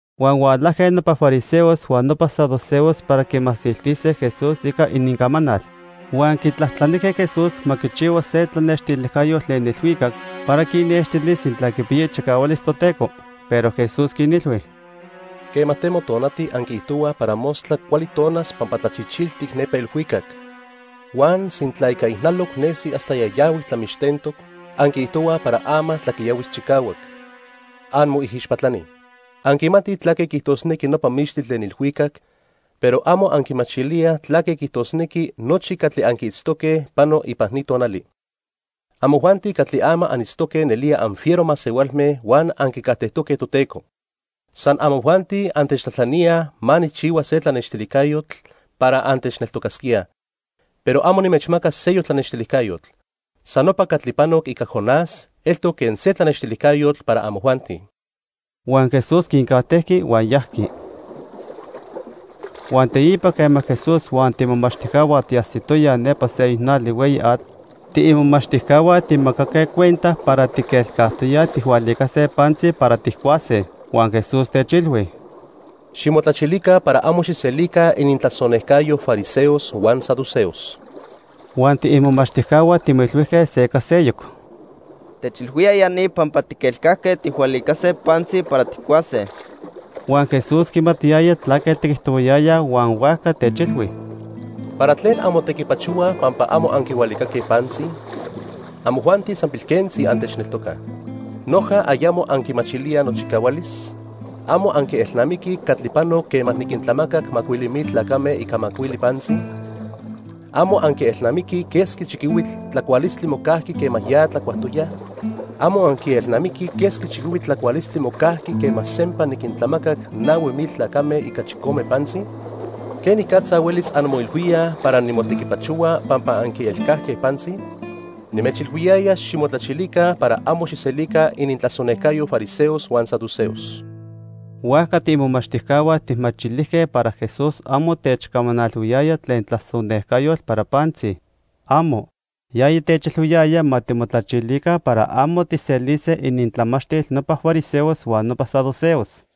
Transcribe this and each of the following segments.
Huan hualajque nopa fariseos huan nopa saduceos para quimasiltise Jesús ica inincamanal. Huan quitlajtlanijque Jesús ma quichihua se tlanextilijcayotl tlen ilhuicac para quinnextilis sintla quipiya ichicahualis Toteco. Pero Jesús quinilhui: "Quema temo tonati anquiijtohuaj para mostla cuali tonas pampa tlachichiltic nepa ilhuicac. Huan sintla ica ijnaloc nesi hasta yayahuic tlamixtentoc, anquiijtohuaj para ama tlaquiyahuis chicahuac. ¡Anmoijixpatlani! Anquimatij tlaque quiijtosnequi nopa mixtli tlen ilhuicac, pero amo anquimachilíaj tlaque quiijtosnequi nochi catli anquiitztoque pano ipan ni tonali. Amojuanti catli ama anitztoque nelía anfiero masehualme huan anquicajtejtoque Toteco. San amojuanti antechtlajtlaníaj ma nijchihua se tlanextilijcayotl para antechneltocasquíaj. Pero amo nimechmacas seyoc tlanextilijcayotl. San nopa catli panoc ica Jonás eltoc quen se tlanextilijcayotl para amojuanti." Huan Jesús quincajtejqui huan yajqui. Huan teipa quema Jesús huan tiimomachtijcahua tiajsitoyaj nepa seyoc nali hueyi atl, tiimomachtijcahua timomacaque cuenta para tiquelcajtoyaj tijhualicase pantzi para tijcuase. Huan Jesús techilhui: —Ximotlachilica para amo xijselica inintlasonejcayo fariseos huan saduceos. Huan tiimomachtijcahua timoilhuijque se ica seyoc: —Techilhuía ya ni pampa tiquelcajque tijhualicase pantzi para tijcuase. Huan Jesús quimatiyaya tlaque tiquijtohuayayaj huan huajca techilhui: —¿Para tlen anmotequipachohuaj pampa amo anquihualicaque pantzi? Amojuanti san pilquentzi antechneltocaj. ¿Noja ayamo anquimachilíaj nochicahualis? ¿Amo anquielnamiquij catli panoc quema niquintlamacac macuili mil tlacame ica macuili pantzi? ¿Amo anquielnamiquij quesqui chiquihuitl tlacualistli mocajqui quema ya tlacuajtoyaj? ¿Amo anquielnamiquij quesqui chiquihuitl tlacualistli mocajqui quema sempa niquintlamacac nahui mil tlacame ica chicome pantzi? ¿Quenicatza huelis anmoilhuíaj para nimotequipachohua pampa anquielcajque pantzi? Nimechilhuiyaya ximotlachilica para amo xijselica inintlasonejcayo fariseos huan saduceos. Huajca tiimomachtijcahua tijmachilijque para Jesús amo techcamanalhuiyaya tlen tlasonejcayotl para pantzi. ¡Amo! Yaya techilhuiyaya ma timotlachilica para amo tijselise inintlamachtil nopa fariseos huan nopa saduceos.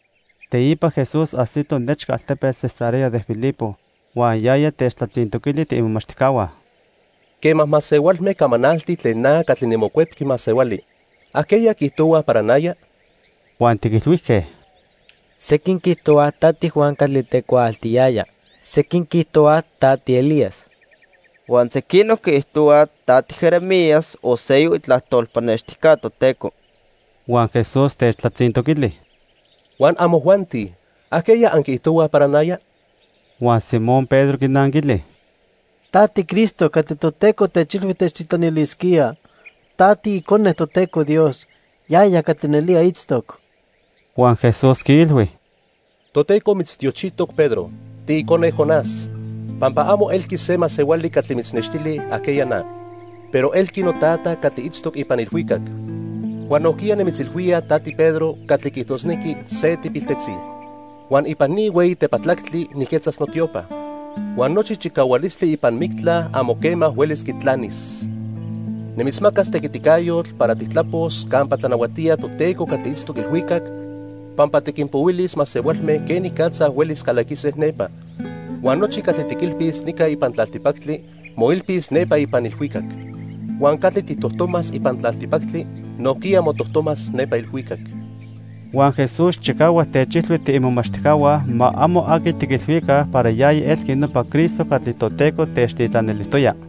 Teipa Jesús ajsito nechca altepetl Cesarea de Filipo. Huan yaya techtlatzintoquili tiimomachtijcahua: —Quema masehualme camanaltij tlen na catli niMocuepqui Masehuali, ¿ajqueya quiijtohuaj para naya? Huan tiquilhuijque: —Sequin quiijtohuaj ta tiJuan catli tecuaaltiyaya. Sequin quiijtohuaj ta tiElías. Huan sequinoc quiijtohuaj ta tiJeremías o seyoc itlajtol pannextijca Toteco. Huan Jesús techtlatzintoquili: —¿Huan amojuanti? ¿Ajqueya anquiijtohuaj para naya? Huan Simón Pedro quinanquili: —Ta tiCristo catli Toteco techilhui techtitlanilisquía. Ta tiIcone Toteco Dios, yaya catli nelía itztoc. Huan Jesús quiilhui: —Toteco mitztiochijtoc Pedro, tiicone Jonás, pampa amo elqui se masehuali catli mitznextili ajqueya na, pero elqui noTata catli itztoc ipan ilhuicac. Huan nojquiya nimitzilhuía ta tiPedro catli quiijtosnequi se tipiltetzi. Huan ipan ni hueyi tepatlactli nijquetzas notiopa. Huan nochi chicahualistli ipan mictla amo quema huelis quitlanis. Nimitzmacas tequiticayotl para tijtlapos campa tlanahuatía Toteco catli itztoc ilhuicac, pampa tiquinpohuilis masehualme quenicatza huelis calaquise nepa. Huan nochi catli tiquilpis nica ipan tlaltipactli, moilpis nepa ipan ilhuicac. Huan catli tijtojtomas ipan tlaltipactli, nojquiya motojtomas nepa ilhuicac. Huan Jesús chicahuac techilhui tiimomachtijcahua ma amo aqui tiquilhuica para yaya elqui nopa Cristo catli Toteco techtitlanilijtoya.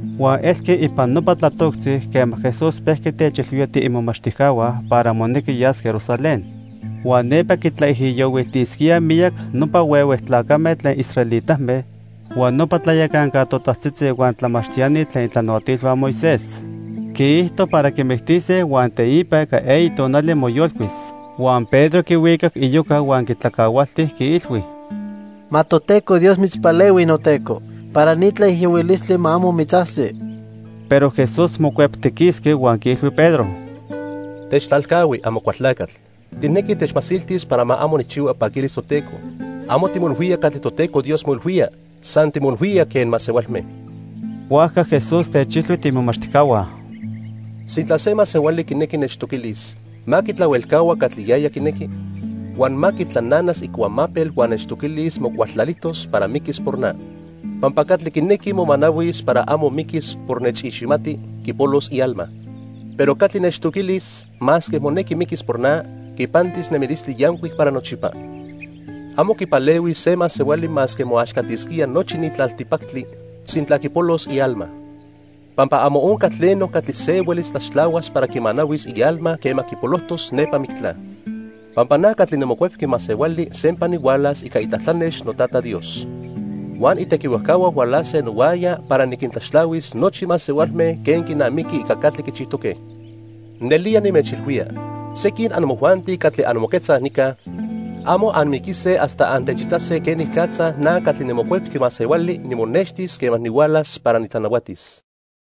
Huan elqui ipan nopa tlatoctzi quema Jesús pejqui techilhuía tiimomachtijcahua para monequi yas Jerusalén. Huan nepa quitlaijiyohuiltisquíaj miyac nopa huehue tlacame tlen israelitame, huan nopa tlayacanca totajtzitzi huan tlamachtiani tlen itlanahuatilhua Moisés. Quiijto para quimictise huan teipa ica eyi tonali, moyolcuis. Huan Pedro quihuicac iyoca huan quitlacahualti, quiilhui: —Ma Toteco Dios mitzpalehui, noTeco, para ni tlaijiyohuilistli ma amo mitzajsi. Pero Jesús mocueptiquisqui huan quiilhui Pedro: —Techtlalcahui, Amocualtlacatl. Tijnequi techmasiltis para ma amo nijchihua ipaquilis Toteco. Amo timoilhuía catli Toteco Dios moilhuía, san timoilhuía quen masehualme. Huajca Jesús techilhui tiimomachtijcahua: —Sintla se masehuali quinequi nechtoquilis, ma quitlahuelcahua catli yaya quinequi. Huan ma quitlananas icuamapel huan nechtoquilis mocualtlalijtos para miquis por na. Pampa catli quinequi momanahuis para amo miquis por nechiximati, quipolos ialma. Pero catli nechtoquilis masque monequi miquis por na, quipantis nemilistli yancuic para nochipa. Amo quipalehuis se masehuali masque moaxcatisquía nochi ni tlaltipactli, sintla quipolos ialma. Pampa amo onca tleno catli se huelis tlaxtlahuas para quimanahuis ialma quema quipolojtos nepa mictla. Pampa na catli niMocuepqui Masehuali sempa nihualas ica itlatlanex noTata Dios. Huan itequihuajcahua hualase nohuaya para niquintlaxtlahuis nochi masehualme quen quinamiqui ica catli quichijtoque. Nelía nimechilhuía, sequin amojuanti catli anmoquetzaj nica, amo anmiquise hasta antechitase quenicatza na catli niMocuepqui Masehuali nimonextis quema nihualas para nitlanahuatis.